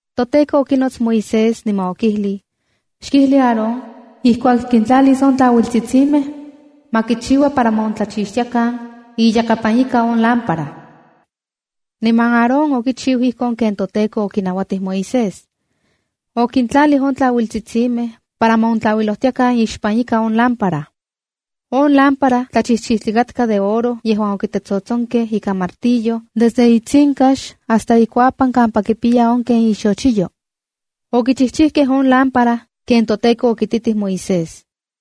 ToTEKO okinots Moisés niman okijlij: “Xkijli Aarón ijkuak kintlalis on tlauiltsitsimej, ma kichiua para ma ontlauilojtiakan iyakapan ika on lámpara.” Niman Aarón okichiu ijkon ken toTEKO okinauatij Moisés. Okintlalij on tlauiltsitsimej para ma on tlauilojtiakan ixpan ika on lámpara. On lámpara tlachijchijtli katka de oro yejuan okitetsotsonkej ikan martillo desde itsinkax hasta ikuapan kampa kipiya on ken ixochiyo. Okichijchijkej on lámpara ken toTEKO okititij Moisés.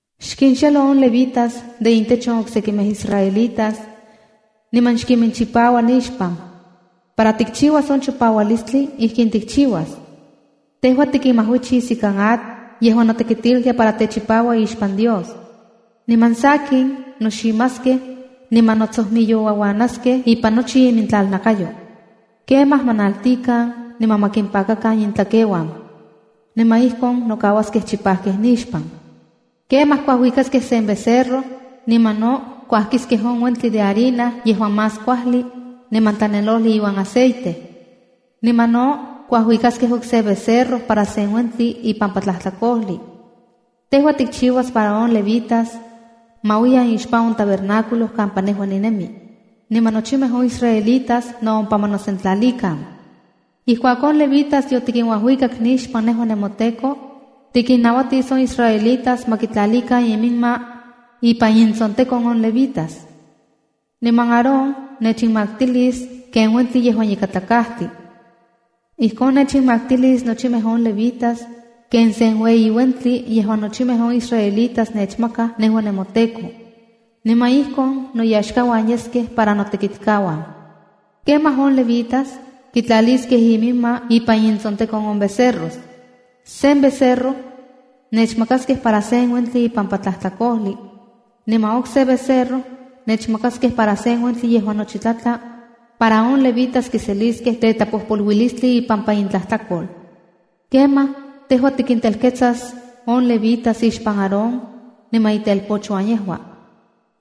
“Xkinxelo on levitas de intech on oksekimej israelitas, niman xkiminchipaua nixpan. Para tikchiuas on chipaualistli, ijkin tikchiuas: Tejua tikinmajuichis ikan atl yejuan notekitiltia para techipaua ixpan Dios. Niman sakin, noximaskej niman notsojmiyouauanaskej ipan nochi imintlalnakayo. Kemaj ma naltikan, niman ma kimpakakan intlakeuan, niman ijkon nokauaskej chipajkej nixpan. Kemaj kuajuikaskej sen becerro, niman no kuajkiskej on uentli de harina yejuan más kuajli niman tlanelojli iuan aceite. Niman no, kuajuikaskej okse becerro para sen uentli ipampa tlajtlakojli. Tejua tikchiuas para on levitas ma uiyan ixpan on tabernáculo kampa nejua ninemi, niman nochimej on israelitas no ompa ma nosentlalikan. Ijkuak on levitas yotikinuajuikak nixpan nejua nemoTEKO, tikinnauatis on israelitas ma kitlalikan iminma ipan intsontekon on levitas. Niman Aarón nechinmaktilis ken uentli yejuan ikatlakajtli. Ijkon nechinmaktilis nochimej on levitas ken sen ueyi uentli yejuan nochimej on israelitas nechmakaj nejua nemoTEKO. Niman ijkon noyaxkauan yeskej para notekitkauan. ’Kemaj on levitas kitlaliskej iminma ipan intsontekon on becerros. Sen becerro nechmakaskej para sen uentli ipampa tlajtlakojli, niman okse becerro nechmakaskej para sen uentli yejuan nochi tlatla para on levitas kiseliskej tetlapojpoluilistli ipampa intlajtlakol. Kemaj tejua tikintelketsas on levitas ixpan Aarón niman itelpochuan yejua,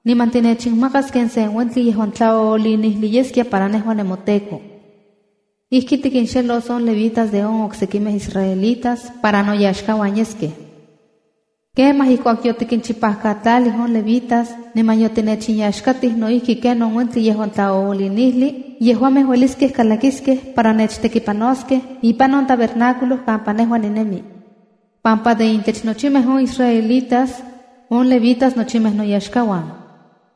niman tinechinmakas ken sen uentli yejuan tlaoolinijli yeskia para nejua nemoTEKO. Ijki tikinxelos on levitas de on oksekimej israelitas para noyaxkauan yeskej. Kemaj ijkuak yotikinchipajkatlalij on levitas, niman yotinechinyaxkatij no ijki ken on uentli yejuan tlaoolinijli, yejuamej ueliskej kalakiskej para nechtekipanoskej ipan on tabernáculo kampa nejua ninemi, pampa de intech nochimej on israelitas on levitas nochimej noyaxkauan.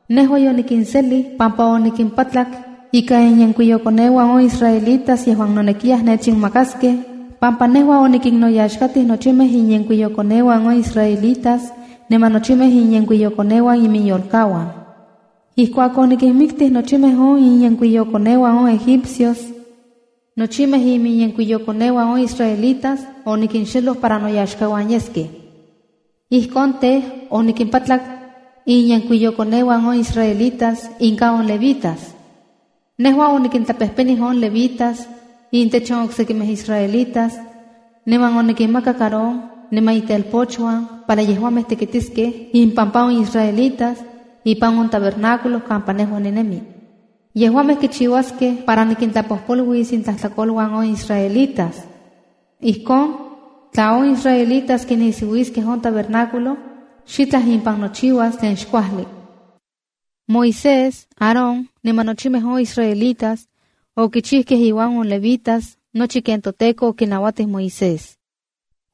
Nejua yonikinselij pampa onikimpatlak ika inyenkuiyokoneuan on israelitas yejuan nonekiyaj nechinmakaskej, pampa nejua onikinnoyaxkatij nochimej inyenkuiyokoneuan on israelitas niman nochimej inyenkuiyokoneuan iminyolkauan. Ijkuak onikinmiktij nochimej on inyenkuiyokoneuan on Egipcios, nochimej iminyenkuiyokoneuan on israelitas onikinxeloj para noyaxkauan yeskej. Ijkon tej, onikimpatlak inyenkuiyokoneuan on israelitas inka on levitas. Nejua onikintlapejpenij on levitas intech on oksekimej israelitas, niman onikinmakak Aarón niman itelpochuan para yejuamej tekitiskej impampa on israelitas ipan on tabernáculo kampa nejua ninemi. Yejuamej kichiuaskej para nikintlapojpoluilis intlajtlakoluan on israelitas. Ijkon, tla on israelitas kinisiuiskej on tabernáculo, xitlaj impan nochiuas tlen xkuajli.” Moisés, Aarón niman nochimej on israelitas okichijkej iuan on levitas nochi ken toTEKO okinauatij Moisés.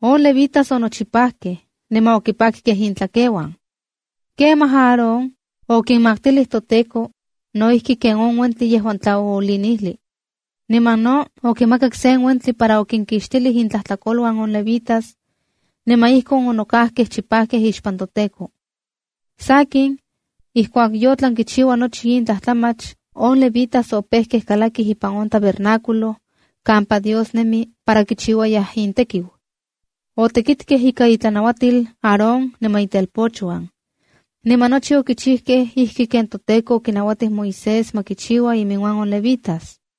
On levitas onochipajkej niman okipakkej intlakeuan. Kemaj Aarón okinmaktilij toTEKO no ijki ken on uentli yejuan tlaoolinijli, niman no okimakak sen uentli para okinkixtilij intlajtlakoluan on levitas, niman ijkon onokajkej chipajkej ixpan toTEKO. Sakin, ijkuak yotlan nochiua nochi in tlajtlamach, on levitas opejkej kalakij ipan on tabernáculo kampa Dios nemi para kichiuayaj intekiu. Otekitkej ika intlanauatil Aarón niman itelpochuan. Niman nochi okichijkej ijki ken toTEKO okinauatij Moisés ma kichiua iminuan on levitas.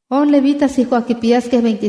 “On levitas ijkuak kipiyaskej